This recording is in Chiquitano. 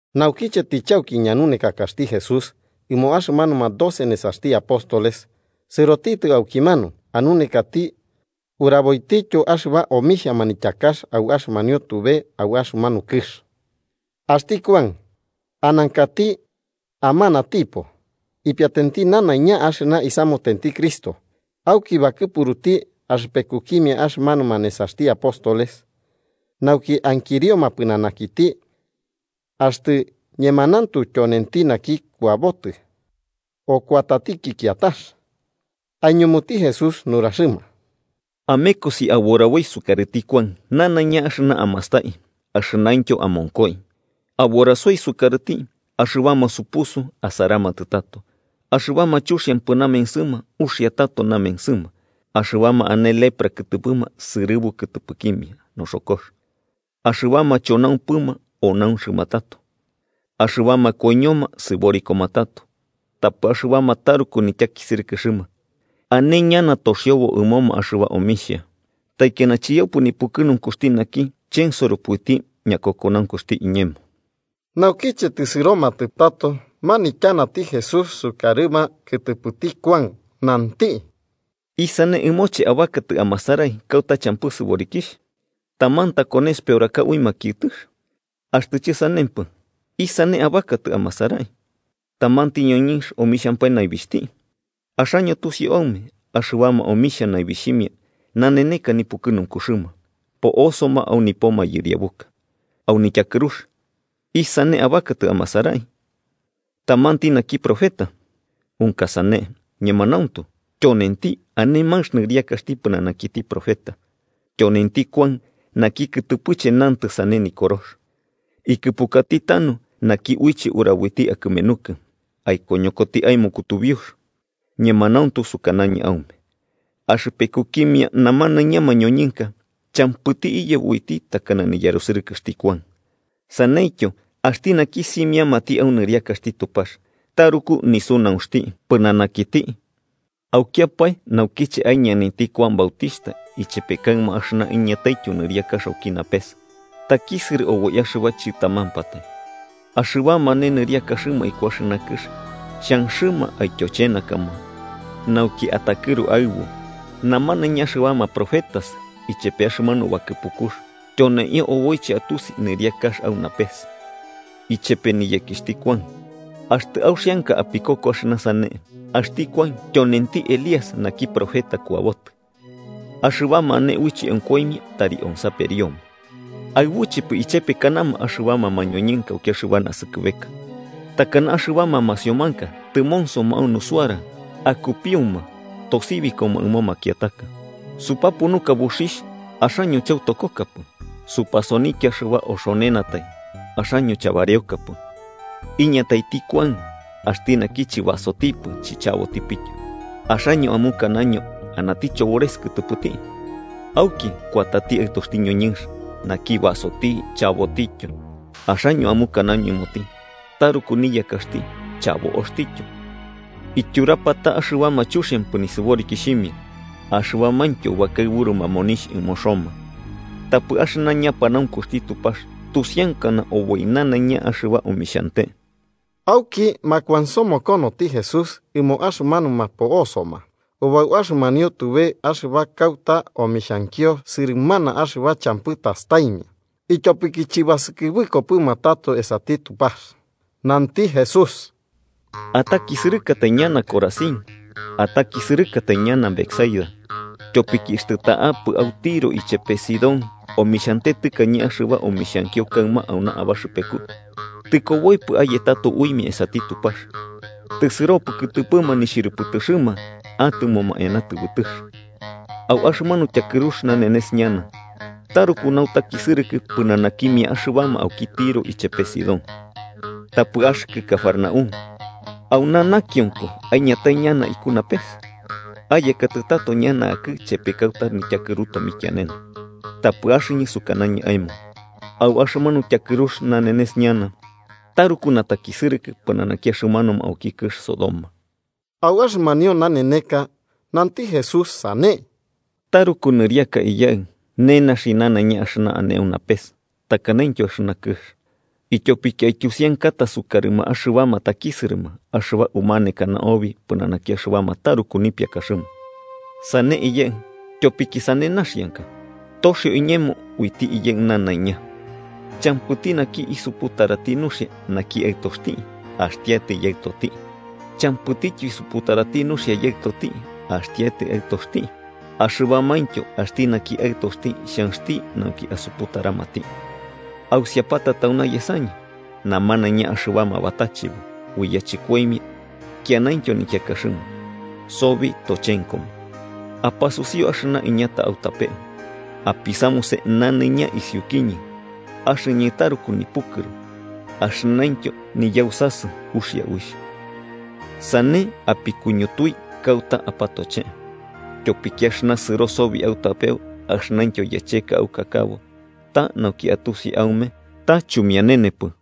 Naukiche tɨchauki ñanunekakaxti Jesús ɨmo axɨmanuma doce nesaxti apóstoles, sɨrotitɨ aukimanu anunekati uraboitityo axɨba omixhia manityakax au axɨmanio tube au axɨmanu kɨx. Axti Kuan, anankati amanatipo, ipiatenti nanaiña axɨna isamutenti Cristo. Auki bakɨpuruti axɨpekukimia axɨmanuma nesaxti apóstoles nauki ankirioma pɨnanakiti axtɨ ñemanauntu tyonenti naki kuabotɨ, o kuatatiki kiatax. Aiñumuti Jesús nuraxɨma: “Amekosi aburaboi sukarɨti Kuan nanaiña axɨna amastai axɨnaintyo amonkoi. Aburasoi sukarɨti axɨbama supusu asaramatɨ tato, axɨbama chuxiampɨ namensɨma uxia tato namensɨma, axɨbama ane lepra kɨtɨpɨma sɨrɨbu kɨtɨpɨkimia noxokox ɨmoma, axɨbama chonaumpɨma onaunxɨma tato, axɨbama koiñoma sɨborikoma tato tapɨ axɨbama taruku nityakisɨrɨkɨxɨma ane ñana toxiobo ɨmoma axɨba omixhia. ¡Taikiana chiyaupɨ nipukɨnunkuxti naki chensoropɨ uiti ñakokonaunkuxti iñemo!” Naukiche tɨsɨromatɨ tato, manityanati Jesús sukarɨma kɨtɨpɨti Kuan, nanti: “¿Isane abakatɨ amasarai kauta champɨ sɨborikixh? ¿Taman takones peoraka ui makiɨtɨx? Axtɨ chɨsanempɨ, ¿isane abakatɨ amasarai? ¿Tamanti ñoñɨnx omixhampae naibixhti? Axaño tusiu aume axɨbama omixhia naibixhimia naneneka nipukɨnunkuxɨma, po'osoma au nipo mayɨriabuka. Au nityakɨrux, ¿isane abakatɨ amasarai? ¿Tamanti naki profeta? Unka sane, ñemanauntu, tyonenti ane manx nɨriakaxti pɨnanakiti profeta. Tyonenti Kuan naki kɨtɨpɨche nantɨ sane Nikorox: ‘Ikɨpukati tanu naki uiche uraboiti akɨmenukɨ, aikoñokoti aemo kutubiux.’ Ñemanauntu sukanañɨ aume, axɨpekukimia namanaiña mañoñɨnka, champɨti iyebo uiti takana niyarusɨrɨkɨxti Kuan. Saneityo, axti naki simiamati au nɨriakaxti Tupax taruku nisunaunxti pɨnanakiti. “Aukiapae naukiche aiñanainti Kuan Bautixhta ichepe kaɨma axɨna iñataityo nɨriakax auki napes takisɨrɨ oboi axɨba chɨtamampatai, axɨbama ane nɨriakaxɨma iku axɨna kɨx xhanxɨma aityochenakama nauki atakɨru aɨbu. Namanaiña axɨbama profetas ichepe axɨmanu bakɨpukux tyoneio oboiche atusi nɨriakax au napes ichepe niyekixhti Kuan. Axtɨ, auxianka apikoko axɨna sane, axti Kuan tyonenti Elías naki profeta kuabotɨ. Axɨbama ane uiche onkoimia, tari onsaperioma. “¿Aɨbuchepɨ ichepekanama axɨbama mañoñɨnka auki axɨba naskɨbeka? Takana axɨbama masiomanka tɨmonsoma au nusuara akupiuma tosibikoma ɨmo makiataka: ‘Supapunuka buxixh, axaño chautokokapɨ. Supasonikia axɨba oxonenatai, axaño chabareokapɨ.’ Iñataiti Kuan, axti naki chɨbasotipɨ chichabotipityo, axaño amukanaño anati chobores kɨtɨpɨti. Auki kuatati Aɨtoxti ñoñɨnx, naki basoti chabotityo, axaño amukanaño ɨmoti taruku niyakaxti chabo'oxtityo, ityurapata axɨbama chuxiampɨ nɨrixhimia axɨbamaintyo bakaɨburuma monixh ɨmo Roma. Tapɨ axɨna ñapanaunkuxti Tupax tusiankana oboi nanaiña axɨba omixhante.” Auki makuansomokonoti Jesús ɨmo axɨmanuma po'osoma ubau axɨmanio tube axɨba kauta omixhankio sɨrɨmana axɨba champɨ tastaimia, ityopiki chɨbasɨkɨbɨkopɨma tato esati Tupax. Nanti Jesús: “¡Atakisɨrɨkatai ñana, Corazín! ¡Atakisɨrɨkatai ñana, Betsaida! Tyopiki axtɨ ta'apɨ au Tiro ichepe Sidón omixhante tɨkañe axɨba omixhankio kaɨma auna abaxɨpeku, tɨkoboipɨ aye tato uimia esati Tupax, tɨsɨropɨ kɨtɨpɨma nixhɨrɨpɨtɨxɨma atɨmoma eana tɨbɨtɨx. Au axɨmanu tyakɨrux nanenes ñana taruku nautakisɨrɨkɨ pɨnanakimia axɨbama auki Tiro ichepe Sidón. Tapɨ axɨkɨ, Cafarnaúm, ¿auna nakionko aiñatai ñana iku napes? ¡Ayekatɨ tato ñana akɨ'ɨ chepe kauta nityakɨru tomikianene! Tapɨ axɨñɨ sukanañɨ aemo au axɨmanu tyakɨrux nanenes ñana taruku natakisɨrɨkɨ pɨnanaki axɨmanuma auki kɨx Sodoma.” Au axɨmanio naneneka, nanti Jesús sane: “Taruku nɨriaka, Iyaɨ, nenaxi nanaiña axɨna ane au napes takanaintyo axɨna kɨx, ityopiki aityusiankata sukarɨma axɨbama takisɨrɨma axɨba umanekana obi pɨnanaki axɨbama taruku nipiakaxɨma. Sane, Iyaɨ, tyopiki sane naxianka.” “Toxio iñemo uiti Iyaɨ nanaiña. Champɨti naki isuputarati nuxia naki Aɨtoxti, axtiatai Yaɨtoti. Champɨtityo isuputarati nuxia Yaɨtoti, axtiatai Aɨtoxti axɨbamaintyo axti naki Aɨtoxti xhanxti nauki asuputaramati. Ausiapata tauna yesañɨ namanaiña axɨbama batachebo ui yachɨkoimia kianaintyo nikiakaxɨma, sobi tochenkoma. Apasusiu axɨna iñata autapeu, apisamuse nanaiña isiukiñɨ, axɨñɨ taruku nipukɨru axɨnaintyo niyausasɨ uxia uixh. Sane apikuñutui kauta apatochee. Tyopiki axɨna sɨro sobi autapeu axɨnaintyo yacheka aukakabo ta nauki atusi aume ta chumianenepɨ.”